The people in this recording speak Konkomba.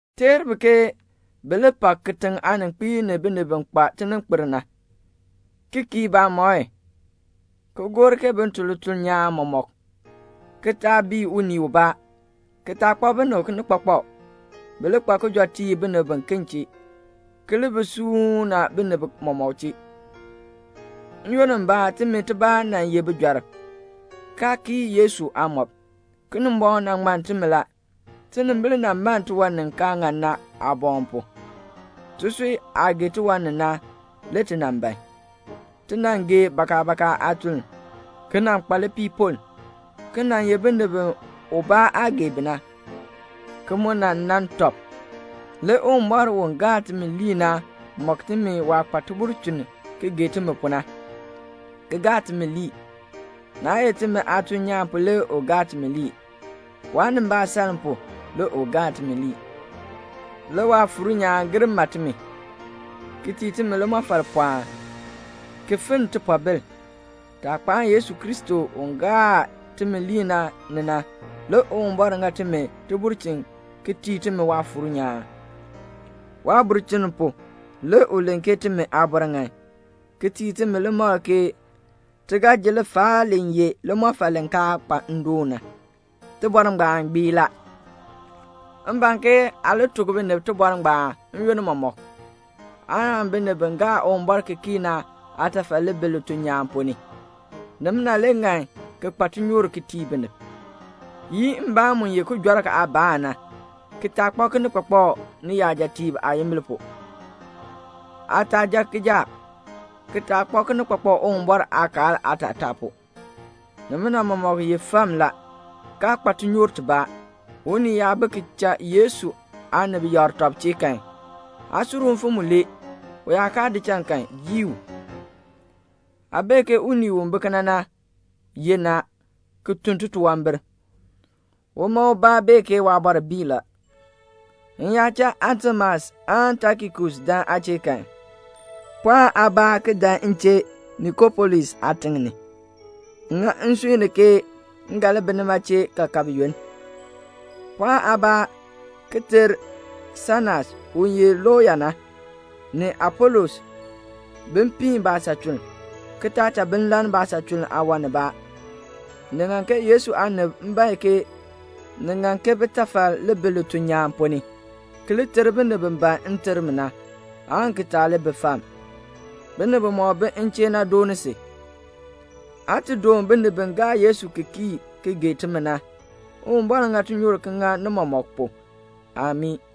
Teer bi ke bi li pak kitiŋ aaninkpiib ni binib bi kpa tininkpil na, ki kii baamɔi, ki gor ke bin tun lituln nyaan mɔmɔk na, ki taa bii unii ubaa, ki taa kpak binib kinikpakpak. Bi li kpa kijɔteek ni binib, ki li bi suuna binib mɔmɔk chee. N-yoonn mbaa timi tibaa nan ye bijɔrb, kaa kii Yesu aamɔb. Kinimbɔŋ nan ŋmann timi la. Tinimbil nan man tiwan ni kaa ŋan na aaboŋ pu. Tisui aah gee tiwan ni na, le ti nan ban. Ti nan gee bakabaka aatuln, ki nan kpa lipiipoln, ki nan ye binib bi ubaa aa gee bi na, ki mu nan nan tɔb. Le Uwumbɔr u ye timi Aaŋmaŋmardaan na mɔk timi waah kpa tibulchin ki gee timi pu na, ki cha ti ŋmar. Naa ye timi aatuln nyaan pu le cha ti ŋmar, waanimbaasaln pu le cha ti ŋmar. Le Waafuur nyaan gir ma timi, ki tii timi limɔfal pɔɔn, ki finn tipoobil. Taah kpaan timi Aaŋmaŋmardaan Yesu Kristo ni na, le Uwumbɔr ŋa timi tibulchin ki tii timi Waafuur nyaan. Waabulchin pu le u len ke timi aabɔr ŋan, ki tii timi limakl ke ti ga ji lifaal li ye limɔfal li kaa kpa ndoon na. Tibɔr ngbaan gbii la. M ban ke aa li tuk binib tibɔr ngbaan n-yoonn mɔmɔk, aan binib bi gaa Uwumbɔr ki kii na aatafal li bi lituln nyaan ponn ni. Nimina le ŋan ki kpa tinyoor ki tii binib. Yii mbaan mu ye kijɔrk aabaan na, ki taa kpak kinikpakpak niyajatiib aayimbil pu. Aa taa jan kijaak, ki taa kpak kinikpakpak Uwumbɔr aakaal aatataa pu. Nimina mɔmɔk ye fam la, kaa kpa tinyoor tibaa. Unii yaa bi ki cha Yesu aanib yakr tɔb chee kan, aa sur u mfim mulee. U yaa kaa di cha kan, yii u. Aa bee ke unii u bi kena na yenn a, ki tun titunwambir. Uma ubaa bee ke waabɔr bii la. M yaa cha Atemas aan Tikikus buen aa chee kan, pɔɔn aabaa ki dan m chee Nikopolis aatiŋ ni; m ŋa nsui ni ke m ga li bi nima chee kaakab yoonn. Pɔɔn aabaa ki ter Senas, u ye looya na, ni Apolos, bin piin baasachuln, ki taa cha bi lann baasachuln aawan nibaa. Ni ŋan ke Yesu aanib bae ke ni ŋan ke bitafal li bi lituln nyaan ponn ni, ki li ter binib bi ban nterm na, aan ki taa li bi fam. Binib bimɔk bi m chee na dooni si. Aa ti doon binib bi gaa Yesu ki kii ki gee timi na. Uwumbɔr ŋa tinyoor ŋa ni mɔmɔk pu. [Amii.]